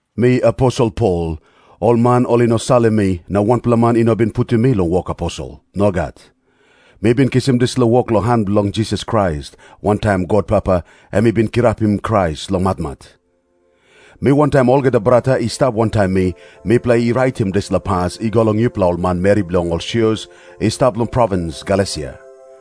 Mi aposel Pol. Ol man ol i no salim mi, na wanpela man i no bin putim mi long wok aposel. Nogat. Mi bin kisim dispela wok long han bilong Jisas Krais wantaim God Papa, em i bin kirapim Krais long matmat. Mi wantaim olgeta brata i stap wantaim mi, mipela i raitim dispela pas i go long yupela ol manmeri bilong ol sios i stap long provins Galesia.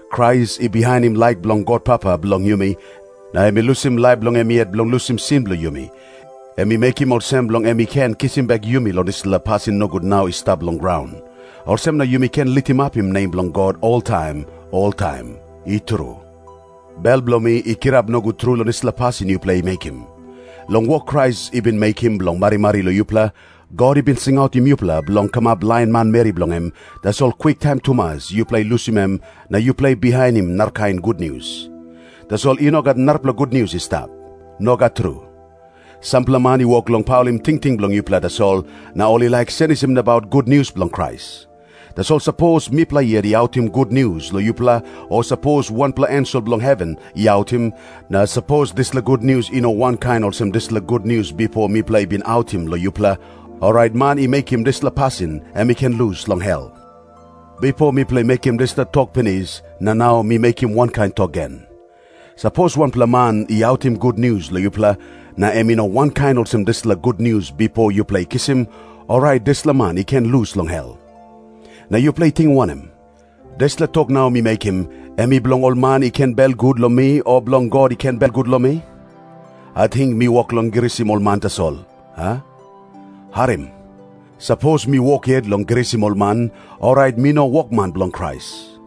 Krais i bihainim laik bilong God Papa bilong yumi, na em i lusim laip bilong em yet bilong lusim sin bilong yumi. Em i mekim olsem bilong em i ken kisim bek yumi long dispela pasin nogut nau i stap long graun. Olsem na yumi ken litimapim nem bilong God oltaim oltaim. I tru. Bel bilong mi i kirap nogut tru long dispela pasin yupela i mekim. Long wok Krais i bin mekim bilong marimari long yupela, God i bin singautim yupela bilong kamap lain manmeri bilong em, tasol kwiktaim tumas yupela i lusim em, na yupela i bihainim narakain gutnius. Tasol i no gat narapela gutnius i stap. Nogat tru. Sampela man i wok long paulim tingting bilong yupela tasol, na ol i laik senisim nabaut gutnius bilong Krais. Tasol sapos mipela yet i autim gutnius long yupela o sapos wanpela ensel bilong heven i autim, na sapos dispela gutnius i no wankain olsem dispela gutnius bipo mipela i bin autim long yupela, orait man i mekim dispela pasin, em i ken lus long hel. Bipo mipela i mekim dispela tok pinis, na nau mi mekim wankain tok gen. Sapos wanpela man i autim gutnius long yupela, na em i no wankain olsem dispela gutnius bipo yupela i kisim, orait dispela man i ken lus long hel. Na yupela i ting wanem? Dispela tok nau mi mekim, em i bilong ol man i ken belgut long mi o bilong God i ken belgut long mi? Ating mi wok long grisim ol man tasol, a? Harim. Sapos mi wok yet long grisim ol man, orait mi no wokman bilong Krais.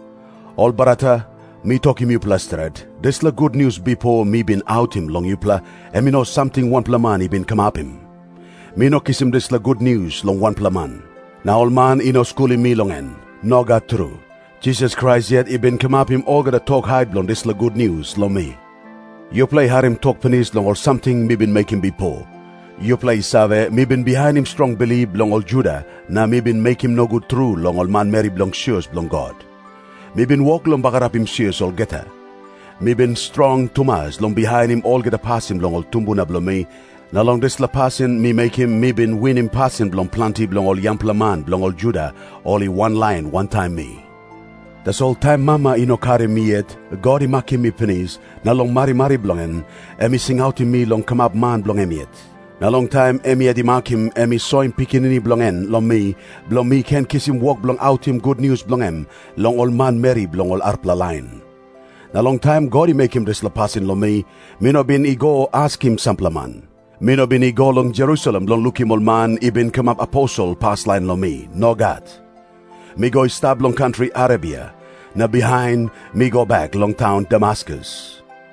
Ol brata, mi tokim yupela stret, dispela gutnius bipo mi bin autim long yupela, em i no samting wanpela man i bin kamapim. Mi no kisim dispela gutnius long wanpela man. Na ol man i no skulim mi long en. Nogat tru. Jisas Krais yet i bin soim gutnius long mi. Yupela i harim tok pinis long ol samting mi bin mekim bipo. Yupela i save, mi bin bihainim strong bilip bilong ol Juda, na mi bin mekim nogut tru long ol manmeri bilong sios bilong God. Mi bin wok long bagarapim sios olgeta. Mi bin strong tumas long bihainim olgeta pasin bilong ol tumbuna bilong mi, na long dispela pasin mi mekim mi bin winim pasin bilong planti bilong ol yangpela man bilong ol Juda ol i wanlain wantaim mi. Tasol taim mama i no karim mi yet, God i makim mi pinis, na long marimari bilong en, em i singautim mi long kamap man bilong em yet. Na long taim em yet i makim em i soim Pikinini bilong en long mi, bilong mi ken kisim wok bilong autim gutnius bilong em long ol manmeri bilong ol arapela lain. Na long taim God i mekim dispela pasin long mi, mi no bin i go askim sampela man. Mi no bin i go long Jerusalem bilong lukim ol man i bin kamap aposel paslain long mi. Nogat. Mi go i stap long kantri Arebia. Na bihain mi go bek long taun Damaskus.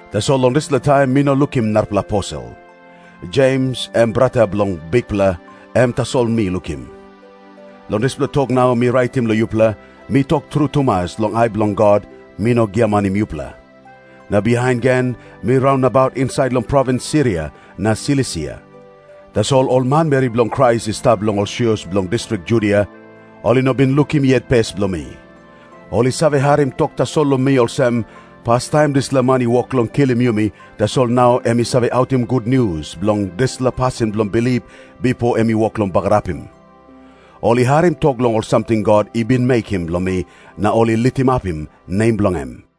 Tasol long dispela taim mi no lukim narapela aposel. Jems, em brata bilong Bikpela, em tasol mi lukim. Long dispela tok nau mi raitim long yupela, mi tok tru tumas long ai bilong God, mi no giamanim yupela. Na bihain gen mi raun nabaut insait long provins Siria na Silisia. Tasol ol manmeri bilong Krais i stap long ol sios bilong distrik Judia, ol i no bin lukim yet pes bilong mi. Ol i save harim tok tasol long mi olsem, "Pastaim dispela man i wok long kilim yumi, tasol nau em i save autim gutnius bilong dispela pasin bilong bilip bipo em i wok long bagarapim." Ol i harim tok long ol samting God i bin mekim long mi, na ol i litimapim nem bilong em.